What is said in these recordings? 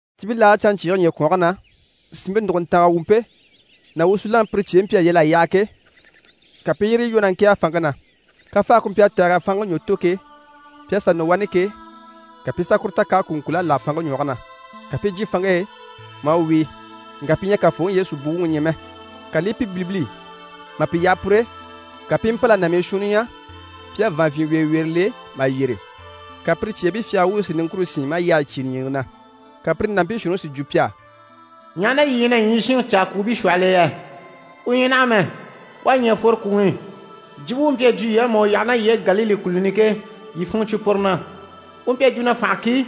Cibilaage canɲcyiige ɲyɛ̀kwɔnge na, sìnmpe nùguntanga wumpe ná wusunaŋi pire cyeebii mpyi a yal'a yaha ke, ka pi i yire lwɔ́ na ŋkɛ̀ɛge fanŋke na. Kafaage ku mpyi a tɛ̀g'a fanŋke ɲwɔ tò ke, pi à sà nɔ wani ke, ka pi i sà kuru ta k'à kùuŋkul'a láha fanŋke ɲwɔge na. Ka pi i jyè fanŋke e maa wíi, ŋka pi ɲyɛ a Kafooŋi Yesu buwuŋi ɲya mɛ. Ka li i pi bilibili. Mà pi yaha pur'e, ka pi i mpâl'a nàmii shuunni ɲya pi à vàanvyinweeweere le mà yyére. Ka pire cyeebii fyagara wuubii si niŋkure sín maa yyahayi cyígile ɲìŋke na. Ka pire nàmpii shuunniŋi si jwo pi á: «Ɲaha na yii ɲyɛ na ɲyii shinŋi caa kwùubii shwɔhɔl'e yɛ? U ɲyɛ naha mɛ. U à ɲɛ̀ a fworo kwùŋi i. Jwumpe u mpyi a jwo yii á mà u yaha ná yii e Galile kùluni i ke, yii funŋɔ cwo puru na. U mpyi a jwo na “Fànha ki,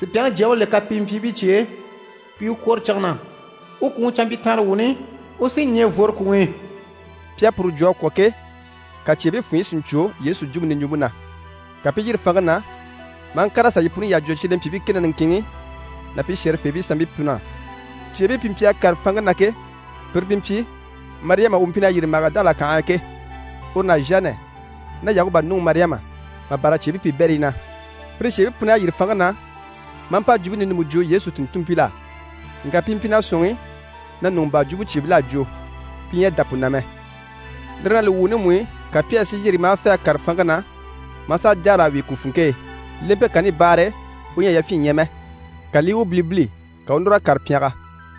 Supyaŋi Jyaŋi u le kapimpyiibii cye e, pi i u kwòro cige na. U kwùŋi canmpyitanrewuuni, u sí ɲɛ̀ n‑fworo kwùŋi i.”» Pi à puru jwo a kwɔ̀ ke, ka cyeebii funɲyi si ɲcwo Yesu jwumpe niɲjwumpe na. Ka pi i yîri fanŋke na maa ŋkàr'a sà yi puni yyaha jwo cyelempyiibii kɛ ná niŋkinŋi ná pi shɛ̀rɛfeebii sanmpii pun'á. Cyeebii pi mpyi a kàre fanŋke na ke, pire pi mpyi: Mariyama u mpyi na yîri Magidala kànhe e ke, uru ná Zhanɛ ná Yakuba nuŋi Mariyama mà bâra cyeebii piibɛrii na. Pire cyeebii pun'à yîri fanŋke na, maa mpa jwumpe ninumpe jwo Yesu tùnntunmpil'á. Ŋka pi mpyi na sɔ̂nŋi na ɲùŋɔ baa jwumɔ cyeebil'à jwo. Pi ɲyɛ a dá pu na mɛ. Lire ná li wuuni mú i, ka Pyɛri si yîri maa fê a kàre fanŋke na, maa sà jâara a wíi ku funŋke e. Lempe kanni baare e, u ɲyɛ a yafyin ɲya mɛ. Ka li i u bilibili, ka u u núr'a kàre pyɛngɛ.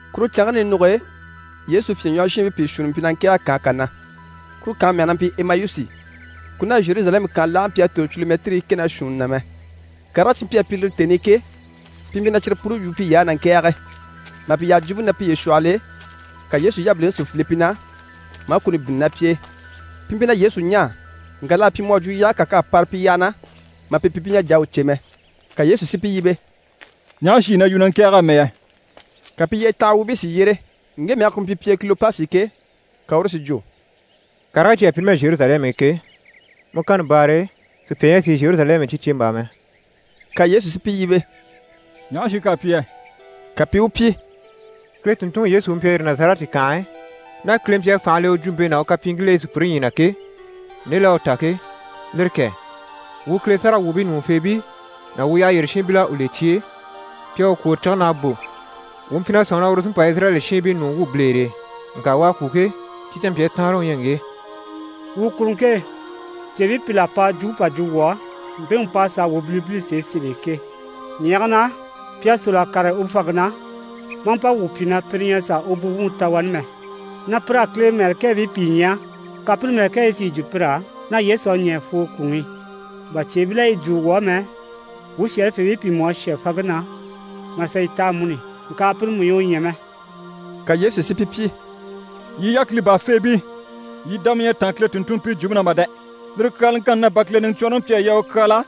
Kuru canŋke ninuge e, Yesu fyèɲwɔhɔshiinbii pìi shuunni mpyi na ŋkɛ̀ɛge kànhe kà na, kuru kànhe mɛge na mpyi Emayusi. Ku ná Zheruzalɛmu kànhe laage mpyi a tòro culumɛtirii kɛ ná shuunni na mɛ. Karigii cyi mpyi a pyi lire tèni i ke, pi mpyi na cyire puni yu piy'á, na ŋkɛ̀ɛge. Mà pi yaha jwumpe na piye shwɔhɔl'e, ka Yesu yabiliŋi si file pi na, maa kuni bínni ná pi e. Pi mpyi na Yesu ɲaa, ŋka l'à pyi mu à jwo yaage kà k'à para pi yyaha na, mà pi pyi pi ɲyɛ a jà a u cè mɛ. Ka Yesu si pi yíbe: «Ɲaha shi yii na yu, na ŋkɛ̀ɛge amɛ yɛ?» Ka pi yyetanha wuubii si yyére. Ŋge mɛge ku mpyi pi e Kilopasi ke, ka uru si jwo: «Karigii cyi à pyi numɛ Zheruzalɛmu i ke, mu kanni baare e, sùpya ɲyɛ a sìi Zheruzalɛmu i cyi cèmbaa mɛ.» Ka Yesu si pi yíbe: «Ɲaha shi k'à pyi yɛ?» Ka pi i u pyi: «Kile tùnntunŋi Yesu u mpyi a yîri Nazarɛti kànhe e, ná Kile mpyi a fànha le u jwumpe ná u kapyiiŋkil'e sùpyire ɲyii na ke, nde l'à u ta ke, lire kɛ! Wuu Kile sáragawwuubii ɲùŋufeebii ná wuu yyaha yyére shiinbil'à u le cye e, pi à u kwòro cige na a bò. Wuu mpyi na sɔ̂nŋi na uru u sí n‑pa Izirayɛli shiinbii ɲùŋɔ wwû bilere e. Ŋka u à kwû ke, cyi canmpyaa taanre u ɲyɛ ŋge. Wuu kuruŋke e, cyeebii pìl'à pa jwumpe pà jwo wuu á, mpemu p'à sàa wuu bilibili sèe sèl'e ke. Ɲyɛ̀ge na, pi à sôl'a kàre u fanŋke na, maa mpa wuu pyi na pire ɲyɛ a sà u buwuŋi ta wani mɛ, na pir'à Kile mɛ̀lɛkɛɛbii pìi ɲya, ka pire mɛ̀lɛkɛɛbii si yi jwo pir'á na Yesu à ɲɛ̀ a fworo kwùŋi i. Bà cyeebil'à yi jwo wuu á mɛ, wuu shɛ̀rɛfeebii pìi mú à shà fanŋke na, mà sà yi ta amuni, ŋka pire mú ɲyɛ a u ɲya mɛ.» Ka Yesu si pi pyi: «Yii yákili baafeebii, yii dama ɲyɛ a táan Kile tùnntunmpii jwumpe na mà dɛ! Lire kyaalaŋkanni na, bà Kile Niɲcwɔnrɔŋi mpyi a yaa u kyaala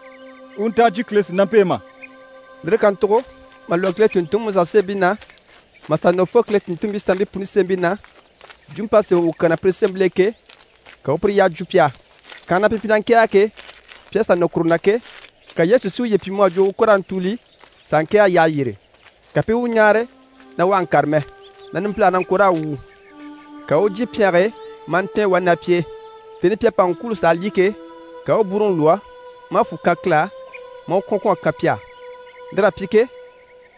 u u nta a jyè Kile sìnampe e mà?» Lire kàntugo mà lwɔ́ Kile tùnntunŋi Musa sémɛbii na, mà sà nɔ fo Kile tùnntunmpii sanmpii puni sémɛbii na, jwumpe p'à sémɛ u kyaa na pire sémɛbil'e ke, ka u u puru yyaha jwo pi á. Kànhe na pi mpyi na ŋkɛ̀ɛge ke, pi à sà nɔ kuru na ke, ka Yesu si uye pyi mu à jwo u ko raa ntùuli s'a ŋkɛ̀ɛge yyaha yyére. Ka pi i u ɲáare na u àha ŋkàre mɛ, na numpilage na ŋko raa wwùu. Ka u u jyè pyɛnge e maa ntɛ̀ɛn wani ná pi e. Tèni i pi à pa ŋkwûulo s'a lyî ke, ka u u bwúuruŋi lwɔ́, maa fwù kan Kile á, maa u kwɔ̀n kwɔ̀n a kan pi á. Lir'à pyi ke,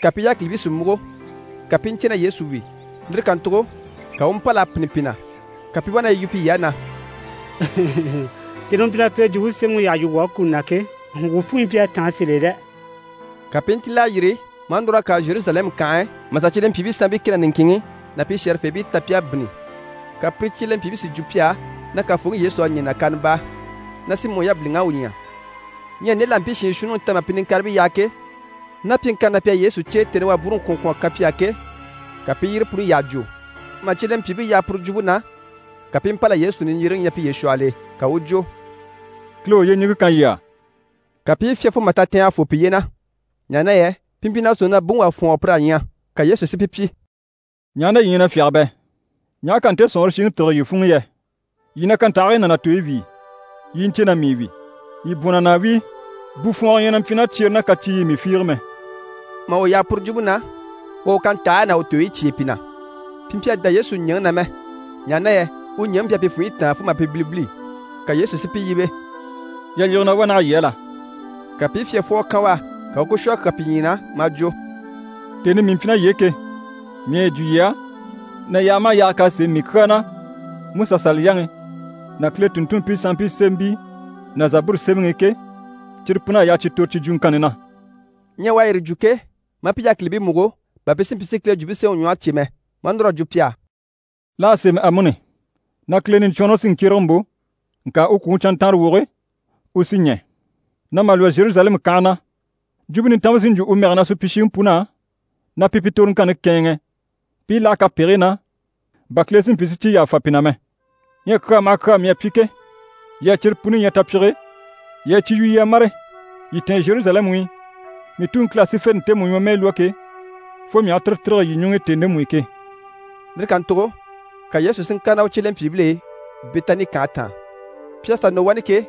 ka pi yákilibii si múgo, ka pi i ɲcè na Yesu wi. Lire kàntugo ka u u mpâl'a pînni pi na. Ka pi i wá na yi yu piy'á na: «Tèni i u mpyi na Kile Jwumpe Semɛŋi yyaha yu wuu á kuni na ke, wuu funɲyi mpyi a táan sèe sèl'e dɛ!» Ka pi i ntíl'a yîri, maa núr'a kàre Zheruzalɛmu kànhe e, mà sà cyelempyiibii sanmpii kɛ ná niŋkinŋi ná pi shɛ̀rɛfeebii ta pi à bínni. Ka pire cyelempyiibii si jwo pi á na Kafooŋi Yesu à ɲɛ̀ nàkaana baa, na Simɔ yabiliŋ'à u ɲya! Ɲyɛ nde l'à mpii shiin shuunniŋi ta mà pi niŋkaribii yaha ke, ná pyiŋkanni na pi à Yesu cè, tèni i u à bwúuruŋi kwɔ̀n kwɔ̀n mà kan pi á ke, ka pi i yire puni yyaha jwo. Mà cyelempyiibii yaha puru jwumpe na, ka pi i mpâl'a Yesu niɲjyereŋi ɲya piye shwɔhɔl'e. Ka u u jwo: «Kile u yyeɲiŋke kan yii á.» Ka pi i fyá fo mà tatɛɛngɛ fô piye na, ɲaha na yɛ pi mpyi na sɔ̂nŋi na buŋi wà fwɔ̀ɔngɔ pir'à ɲya. Ka Yesu si pi pyi: «Ɲaha na yii ɲyɛ na fyáge bɛ? Ɲaha k'à nte sɔ̀nŋɔre shiŋi tîrige yii funŋ'i yɛ? Yii na kantahigii ná na tooyi wíi, yii i ɲcè na mii wi. Yii bwɔ̀n na na a wíi, bufwɔɔngɔ ɲyɛ na mpyi ná cyere ná kaciiy'i mii fiige mɛ.» Mà u yaha puru jwumpe na, u à u kantahigii ná u tooyi cyêe pi na. Pi mpyi a dá Yesu ɲɛ̀ŋi na mɛ, ɲaha na yɛ u ɲɛ̀ŋi mpyi a pi funɲyi táan fo mà pi bilibili. Ka Yesu si pi yíbe: «Yalyige na wá naha yii á la?» Ka pi i fyafwɔgɔ kan u á. Ka u u ku shwɔ a kyà pi ɲyii na. Maa jwo: «Tèni i mii mpyi ná yii e ke, mii à yi jwo yii á na yaaga maha yaaga k'à sémɛ mii kyaa na MusaSaliyaŋi ná Kile tùnntunmpii sanmpii sémɛbii ná Zaburu sémɛŋi i ke, cyire pun'à yaa cyi tòro cyi jwuŋkanni na.» Ɲyɛ u à yire jwo ke, maa pi yákilibii múgo, bà pi si mpyi si Kile Jwumpe Semɛŋi ɲwɔhe cè mɛ. Maa núr'à jwo pi á: «L'à sémɛ amuni na Kile Niɲcwɔnrɔŋi sí n‑kyérege n‑bò, ŋka u kwùŋi canntanrawoge u sí ɲɛ̀. Na mà lwɔ́ Zheruzalɛmu kànhe na, Jwumpe Nintanmpe sí n‑jwo u mɛge na supyishiŋi pun'á, na pi pi toroŋkanni kɛ̂ɛnŋɛ pi i láha kapegigii na, bà Kile si mpyi si cyi yàfa pi na mɛ. Ɲyɛ kyaa maha kyaa mii à pyi ke, yii à cyire puni ɲya tapyige e, yii a cyi yu yii a mâre. Yii tɛ̀ɛn Zheruzalɛmu i, mii Tuŋi Kile à sífente ntemu ɲwɔmɛɛ lwɔ́ ke, fo mii aha tire tîrige yii ɲuŋ'i tèni ndemu i ke.» Lire kàntugo ka Yesu si ŋkàre ná u cyelempyiibil'e Bɛtani kànhe taan. Pi à sà nɔ wani ke,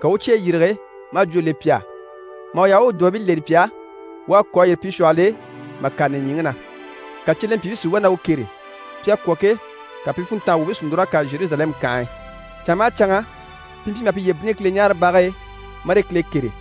ka u u u cyeyi yîrige, maa jwó le pi á. Mà u yaha u u dùbabii leni pi á, u à kò a yîri pi shwɔhɔl'e mà kàre nìɲyiŋi na. Ka cyelempyiibii si wá na u kêre. Pi à kwɔ̀ ke, ka pi funntanga wuubii si núr'a kàre Zheruzalɛmu kànhe e. Canŋa maha canŋa pi mpyi maha piye bínnini Kileɲaarebage e, marii Kile kêre.